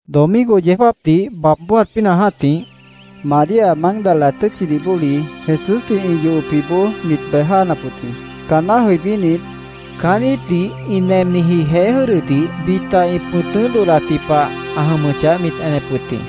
Domingo yeó jáapdih baab bójat pínah jã́tih, María Mágdala tʉ́tchidih bóli, Jesúsdih ĩ yohopjiboó mit bej jáanap wʉt jĩ. Caanná jʉibínit, caán íitdih ĩ nemniji jeé jʉ́dʉdih bita ĩ pʉ̃tʉ́ dodhdatji pah ã jʉmʉchah, mit enep wʉt jĩ.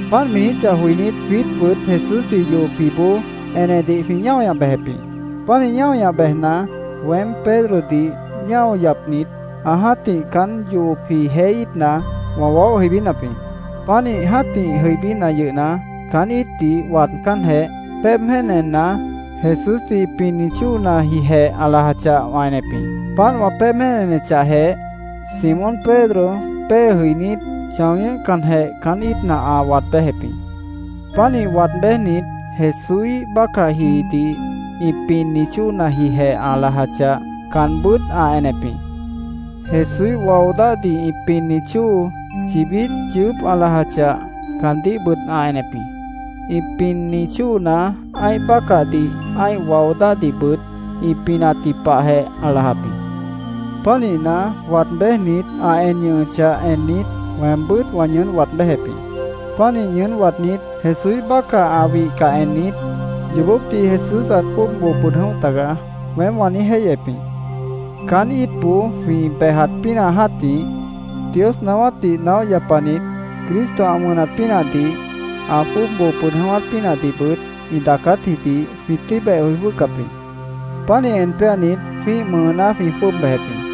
Páant mi niijíchah joinít, jwiítbʉt Jesúsdih ĩ yohopjiboó enedih jwĩ ñáo ñah bejep jĩ. Pánih ñáo ñah bejna, weém Pedrodih ñáo yapnit, ã jã́tih caán yohopji jeé íitna wã waóh jʉibínap jĩ. Pánih jã́tih jʉibína yʉhna, caán íitdih waadcánjeh, péeb jéen enna, Jesúsdih ĩ pinni chóonajijeh ã lajachah, wã enep jĩ. Páant wã péeb jéen enechahjeh, Simón Pedro pée jʉinít, chão ñʉ́hcanjeh, caán íitna ã waad béjep jĩ. Pánih waad béjnit, Jesúíh bácahjidih ĩ pinni chóonajijeh ã lajachah, caanbʉ́t ã enep jĩ. Jesúíh wao dáhdih ĩ pinni chóo chibít yʉʉ́p ã lajachah, caandíhbʉt ã enep jĩ. Ĩ pinni chóona ã́ih bácahdih ã́ih wao dáhdihbʉt ĩ pinatji pahjeh ã lajap jĩ. Pánihna, waad béjnit, ã en ñʉhʉchah ennit, weembʉ́t wã ñʉʉ́n waad béjep jĩ. Pánih ñʉʉ́n waadnít, Jesúíh bácah ã wihcah ennit, “Yoobópdih Jesús ãt jwʉ́ʉb boo pʉd jʉ̃óh tagaá”, weém wã niíj jéihyep jĩ. Caán íitboó jwĩ bejat pínah jã́tih, Dios naáwátdih naóh yapanit Cristo ã wʉnat pínahdih, ã jwʉ́ʉb boo pʉd jʉ̃ʉ́wát pínahdihbʉt ĩ daacátjidih jwĩ tʉ́i beh joi jwʉ́hcap jĩ. Pánih en péanit, jwĩ́ih mʉʉná jwĩ jwʉ́ʉb bejep jĩ.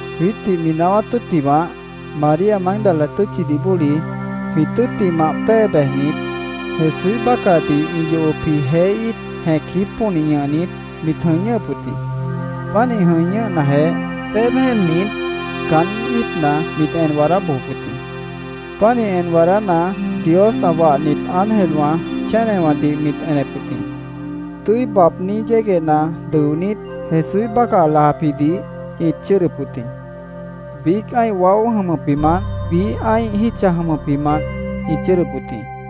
Jwiítdih mi naáwát tʉ́ttimah, María Mágdala tʉ́tchidih bóli jwĩ tʉ́ttimah pée bejnit, Jesúíh bácahdih ĩ yohopji jeé íit jẽc jípónih ñʉhnit, mit jʉ̃i ñʉ́hʉp wʉt jĩ. Pánih jʉ̃i ñʉ́hnajeh, péeb jéennit, caán íitna mit en waadá bojop wʉt jĩ. Pánih en waadána, Dios ã wahnit ángelwã chénewãdih mit enep wʉt jĩ. Tʉ́i baabní yéguehna dʉonít, Jesúíh bácah ã lajapjidih ĩt chʉ́ʉdʉp wʉt jĩ. Biíc ã́ih waó jʉmʉpjimant, biíh ã́ih jítcha jʉmʉpjimant ĩt chʉ́ʉdʉp wʉt jĩ.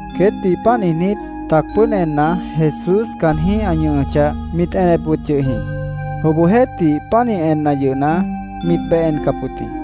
Queétdih páant niijnít, tac pʉ́ʉd enna, Jesús caanjĩ́h ã ñʉhʉchah, mit enep wʉt yʉh jĩ. Obohjeéhtih, pánih enna yʉhna, mit beh encap wʉt jĩ.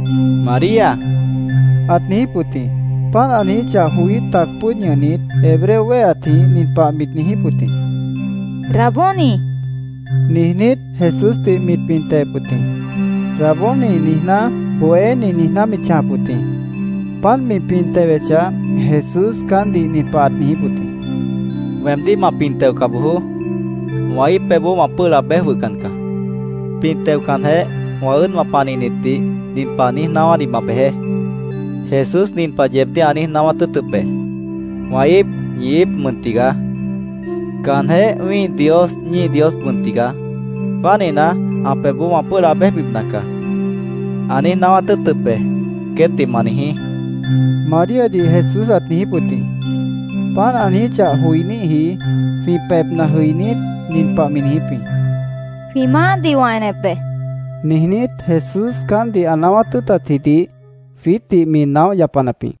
—María, ãt niijíp wʉt jĩ. Páant ã niijíchah joí, tac pʉ́ʉd ñʉhnit, Hebreo wéheatjĩh nin pah mit niijíp wʉt jĩ. —Raboni, niijnít, Jesúsdih mit pin tewep wʉt jĩ. “Raboni”, niijná, “Bohéni”, niijná mit chãjap wʉt jĩ. Páant mi pin tewechah, Jesús caántdih nin pah ãt niijíp wʉt jĩ: —Weemdíh ma pin teoca bojoó. Wã íip pebhboó wã pʉ́ʉh laab béj jwʉhcan caá. Pin teocanjeh, wã ʉ́ʉdwã panihnitdih nin pah niíj naáwádih ma bejeé: ‘Jesús nin pah yeebdíh ã niíj naáwát tʉ́ʉtʉp be: “Wã íip ñi íip mʉn tigaá. Caanjéh wĩ́ih Dios ñíih Dios mʉn tigaá. Pánihna, ã pebhboó wã pʉ́ʉh laab béjbipna caá”, ã niíj naáwát tʉ́ʉtʉp be’, queétdih ma niijí, Maríadih Jesús ãt niijíp wʉt jĩ. Páant ã niijíchah joiníhji jwĩ pebhna jʉinít, nin pah mi niijíp jĩ: “Jwĩ Maáhdih wã enep be”, niijnít, Jesús caántdih ã naáwát tʉ́ʉtatjidih jwiítdih mi naóh yapanap jĩ.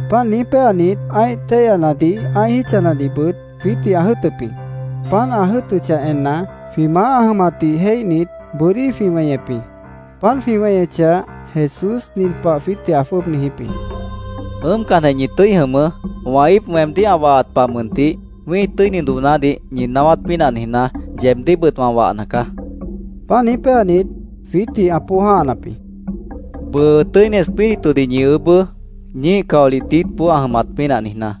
Páant niíj péanit, ã́ih téihyanadih, ã́ih jítchanadihbʉt jwiítdih ã jʉ́ʉtʉp jĩ. Páant ã jʉ́ʉtʉchah enna, jwĩ Maáh ã jʉmatdih jéihnit, bʉ́dí jwĩ weñep jĩ. Páant jwĩ weñechah, Jesús nin pah jwiítdih ã jwʉ́ʉb niijíp jĩ: —Ʉ́ʉmcanjeh, ñi tʉ́i jʉmʉʉ́. Wã íip weemdíh ã wahat pah mʉntih, wĩ́ih tʉ́ini doonádih ñi naáwát pínah niijná, yeebdíhbʉt wã wahna caá, ã niijíp jĩ. Páant niíj péanit, jwiítdih ã póoj jã́hanap jĩ. —Bʉʉ Tʉ́ini Espíritudih ñi ʉbʉʉ́, ñíih caolih diítboó ã jʉmat pínah niijná.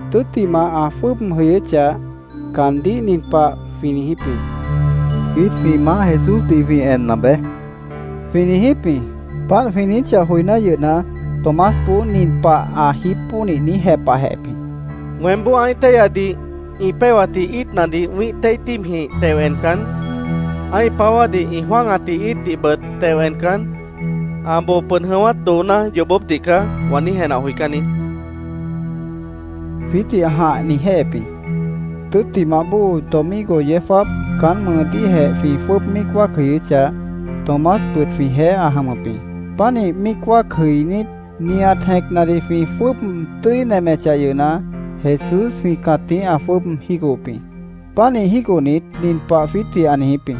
Tʉ́ttimah, ã jwʉ́ʉb jʉyʉ́chah, caandíh nin pah jwĩ niijíp jĩ: —Jwiít jwĩ maáh Jesúsdih jwĩ enna beé, jwĩ niijíp jĩ. Páant jwĩ niijíchah joiná yʉhna, Tomásboó nin pah ã jípónih niíj jepahjehep jĩ: —Weémboó ã́ih téihyadih ĩ péhwatji íitnadih wĩ́ih téih tíibjĩh teo encan, ã́ih páwádih ĩ jwã́agatji íitdihbʉt teo encan, ‘Ã boo pʉd jʉ̃ʉ́wát dooná yoobópdih caá’, wã niíj jenah joicán niít, jwiítdih ã jãh niijjéhep jĩ. Tʉ́ttimah bóo domingo yeó jáap caán mʉʉdíhjeh jwĩ jwʉ́ʉb míic wáac jʉyʉ́chah, Tomásbʉt jwĩjeéh ã jʉmʉp jĩ. Pánih míic wáac jʉinít, nihat jẽcnadih jwĩ jwʉ́ʉb tʉ́i nemechah yʉhna, Jesús jwĩ cãtíh ã jwʉ́ʉb jígohop jĩ. Pánih jígohnit, nin pah jwiítdih ã niijíp jĩ: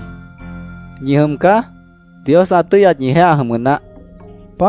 —¿Ñi jʉm caá? Dios ã tʉ́yat ñijeéh ã jʉmʉ naáh, ã niijíp jĩ.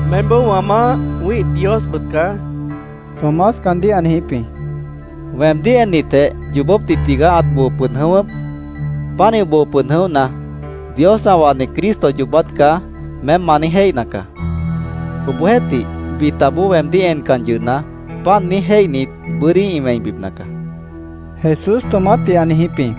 —Meémboó wã Maáh, wĩ́ih Diosbʉt caá, Tomás caandíh ã niijíp jĩ. —Weemdíh ennitjeh, ‘Yoobópdih tigaá ãt boo pʉd jʉ̃ʉ́wʉ́p. Pánih boo pʉd jʉ̃óhna, Dios ã wahni Cristo yoobát caá’, meém ma niíj jéihna caá. Obohjeéhtih, bitaboó weemdíh encan yʉhna, páant niíj jéihnit, bʉ́dí ĩ wẽibipna caá, Jesús Tomásdih ã niijíp jĩ.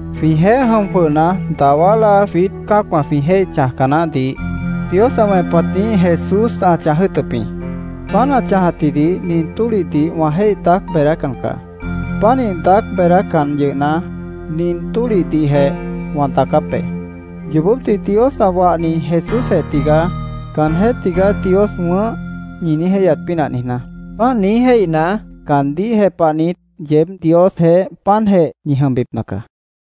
Jwĩjeéh jʉm jwʉhna, dawá láa jwiít cã́acwã jwĩ jéih chãjca naáhdih Dios ã wẽpatjĩh Jesús ã chãj jʉ́ʉtʉp jĩ. Páant ã chãjatjidih nin tólihdih wã jéih daác beedácan caá. Pánih daác beedácan yʉhna, nin tólihdihjeh wã daacáp be, “Yoobópdih Dios ã wahni Jesúsjeh tigaá. Caanjéh tigaá Dios wʉ̃ʉ́h”, ñi niíj jéihyat pínah niijná. Páant niíj jéihna, caandíh jepahnit, yeéb Diosjeéh páantjeh ñi jʉmbipna caá.